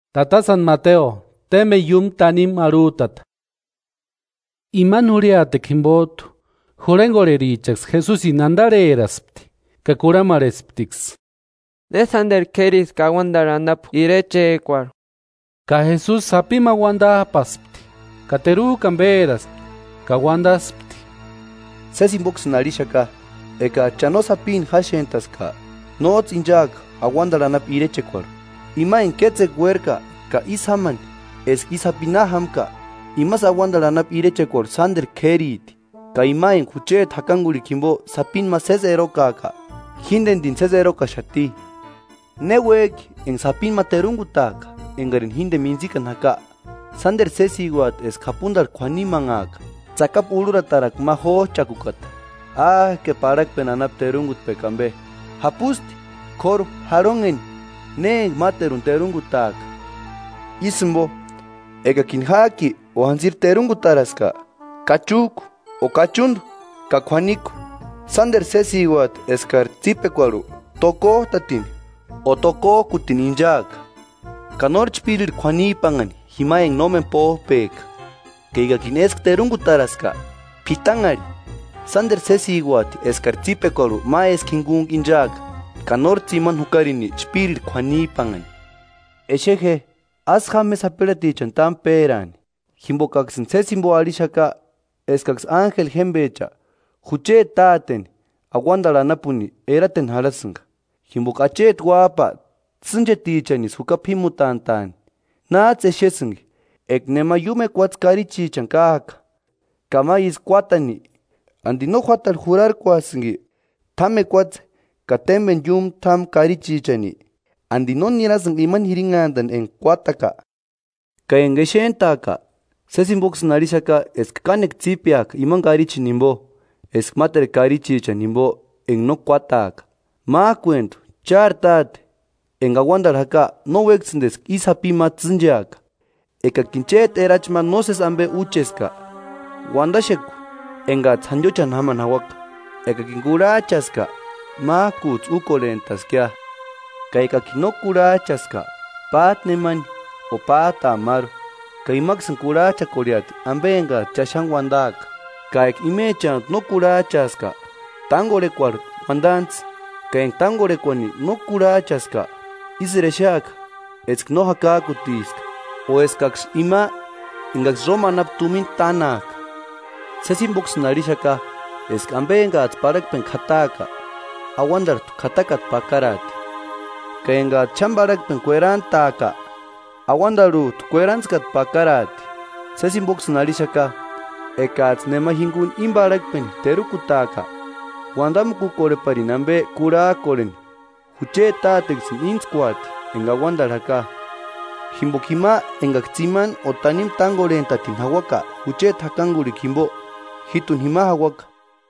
¿Ne sánteru k'ériski? Imani jurhiatekua jimpot'u jurhenkorherichaksï Jesusini antarheraspti ka kurhamarhesptiksï: “¿Ne sánteru k'ériski auantarhu anapu irechekuarhu?” Ka Jesusi sapini ma uantap'aspti ka teruk'ani péraspti, ka uantaspti: “Sési jimpoksïni arhixaka, ekats'ï cha no sapini jáxent'aska, nóts'ï inchaaka auantarhu anapu irechekuarhu. Ima enka kétsekua uérka ka ísï jámani eska i sapi na jámka. Imasï auantarhu anapu irechekuarhu sánteru k'ériti. Ka ima enka jucheti jakankurhikua jimpo sapini ma sési erokaaka, jíntenirini sési erokaxati.” “Ne uék'i enka sapini ma terunkutaaka enkarini jínteni mintsikani jaka, sánteru sésiuati eska japuntarhu k'uinimanhaaka tsakapu urhuratarakua ma jóch'akukata. ¡Áke, parhakpeni anapu terunkutpekua ampe! Japusti, k'óru. ¡Jarhonheni, ne enka máteruni terunkutaaka! Ísï jimpo, ekakini ják'i o jantsiri terunkutaraska, kachuk'u o kachuntu ka k'uaniku, sánteru sésiuati eskari tsípekuarhu tokot'atini o tokok'utini inchaaka, ka nóri chpírirhu k'uanipanhani jima enka nómeni póp'ek'a. Ka ekakini éskua terunkutaraska, p'itanharhi, sánteru sésiuati eskari tsípekuarhu ma éskua jinkuntku inchaaka, ka nóri tsimani jukarini chpírirhu k'uanip'anhani.” “Exe je, ásï jáma je sapirhatichani támu péraani, jimpokaksïni sési jimpo arhixaka eskaksï ánjeli jémpecha, jucheti Táteni auantarhu anapuni erateni jarhasïnka. [Jimpoka Acheti Uáp'a tsînchetichanisï juka p'ímutant'a'ani.]” “¿Náts'ï exesïnki? Eka nema iúmu ekuatse karichichani káak'a ka ma ísï kuátani, ¿Anti no juátarhu jurak'uasïnki t'ámu ekuatse ka témpeni iúmu t'ámu karichichani? ¿Anti no nirasïnki imani jirinhanti enka kuátaka? Ka enka exent'ak'a, sési jimpoksïni arhixaka eska kánekua tsípeaka imani karichini jimpo, eska máteru karichichani jimpo enka no kuátaaka. Mák'uentu, chári Táte enka auantarhu jaka, no uékasïnti eska i sapi ma tsîncheaka.” “Ekakini chéti erachi ma nósesi ampe úcheska, uantaxeku enkats'ï jantiochani jámani jauaka, ekakini kurhach'aska mák'uts'ï úkorhent'askia. Ka ekakini no kurhach'aska, pát'a nemani o pát'aa máru, ka imaksïni kurhach'akorheati ampe enkats'ï cha xáni uantaaka. Ka eka imechantu no kurhach'aaska, tánkorhekuarhu uantantsï, ka enka tánkorhekuani no kurhach'aska, ísïri exeaka eska no jakak'utiska o eskaksï ima enkaksï Róma anapu tumina tának'a.” “Sési jimpoksïni arhixaka eska ampe enkats'ï parhakpeni k'ataaka, auantarhut'u k'atakata pakaraati, ka enkats'ï xáni parhakpeni kuerantaaka; auantarhut'u kuerantskata pakaraati.” “Sési jimpoksïni arhixaka, ekats'ï nema jinkuni íni parhakpeni terukutaaka uantamukukorheparini ampe kurhak'orheni, jucheti Táteksïni íntskuati enka auantarhu jaka. Jimpoka jima enkaksï tsimani o tanimu tánkorhent'atini jauaka jucheti jakankurhikua jimpo, jít'u jima jauaka.”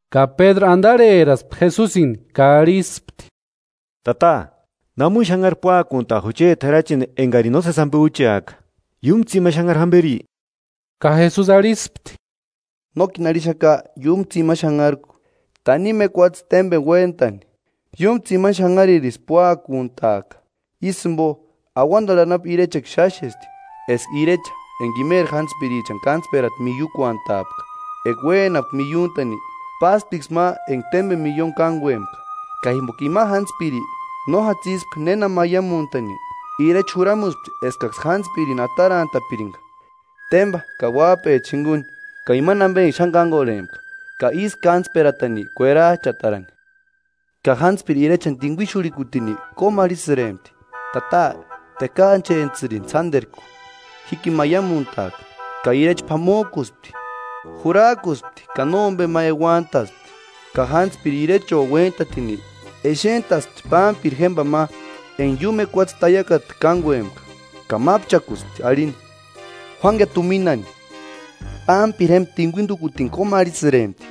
Ka Pédru antarheraspti Jesusini ka arhispti: “Tata, ¿Namuni xanhari púakunta jucheti erachini enkarini nósesi ampe úcheaka? ¿Iúmu tsimani xanhari jamperi?” Ka Jesusi arhispti: “Nókini arhixaka iúmu tsimani xanharku, tanimu ekuatse témpeni uéntani iúmu tsimani xanharirisï púakuntaaka.” “Ísï jimpo, auantarhu anapu irechekua xáxesti, eska irecha enka imeri jántspirichani kántsperata miiukuantaapka. Eka uénapka miiuntani, pásptiksï ma enka témpeni milloni kánkuempka. Ka jimpoka ima jántspiri no játsispka néna maiamuntani, irecha juramuspti eskaksï jántspirini atarantapirinka tempa ka uáp'echa jinkuni ka imani ampe enka xáni kánkorhempka, ka ísï kántsperatani k'uerach'atarani. Ka jántspiri irechani tinkuixurhikutini kómarhisïrempti: ‘Tata, tekaachentsïrini sánterku, jíkini maiamuntaaka.’ Ka irecha p'amok'uspti, jurak'uspti ka nómpe ma euantaspti. Ka jántspiri irecho uéntatini, exent'aspti pámpiri jémpani ma enka iúmu ekuatse taiakata kánkuempka, ka mápchakuspti arhini: ‘Juánkia tuminani.’ Pámpiri jémpa tinkuintukutini kómarhisïrempti: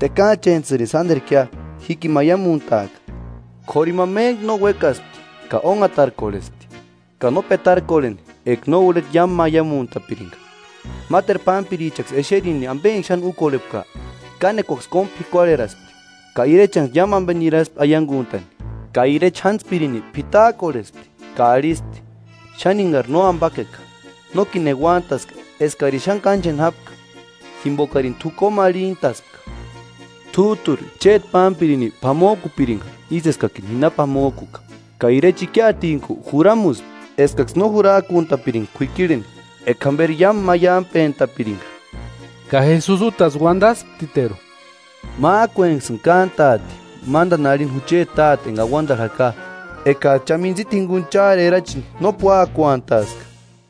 ‘Tekaachentsïrini sánterkia, jíkini maiamuntaaka.’ K'óru ima méntku no uékaspti ka ónhatarkorhespti, ka no petarkorheni eka no urheta iámu maiamuntapirinka. Máteru pámpirichaksï exerini ampe enka xáni úkorhepka, kánekuaksï kómu p'ikuarheraspti, ka irechanksï iámu ampe niraspti aiankunt'ani. Ka irecha jántspirini p'itak'orhespti ka arhispti: ‘Xáni enkari nóampakeka, nókini euantaska eskarini xáni káncheni jápka jimpokarini t'u kómarhintaspka. T'út'uri chéti pámpirini p'amok'upirinka ísï eskani ji na p'amok'uka.’ Ka irecha ikiatintku juramuspti eskaksï no jurak'unt'apirinka k'uikirheni, eka jamperi iámu maiampent'apirinka.” Ka Jesusi útasï uantasptiteru: “Mák'uenksïni kántaati mántani arhini jucheti Táte enka auantarhu jaka, ekats'ï cha mintsita jinkuni chári erachini no púakuantaska.”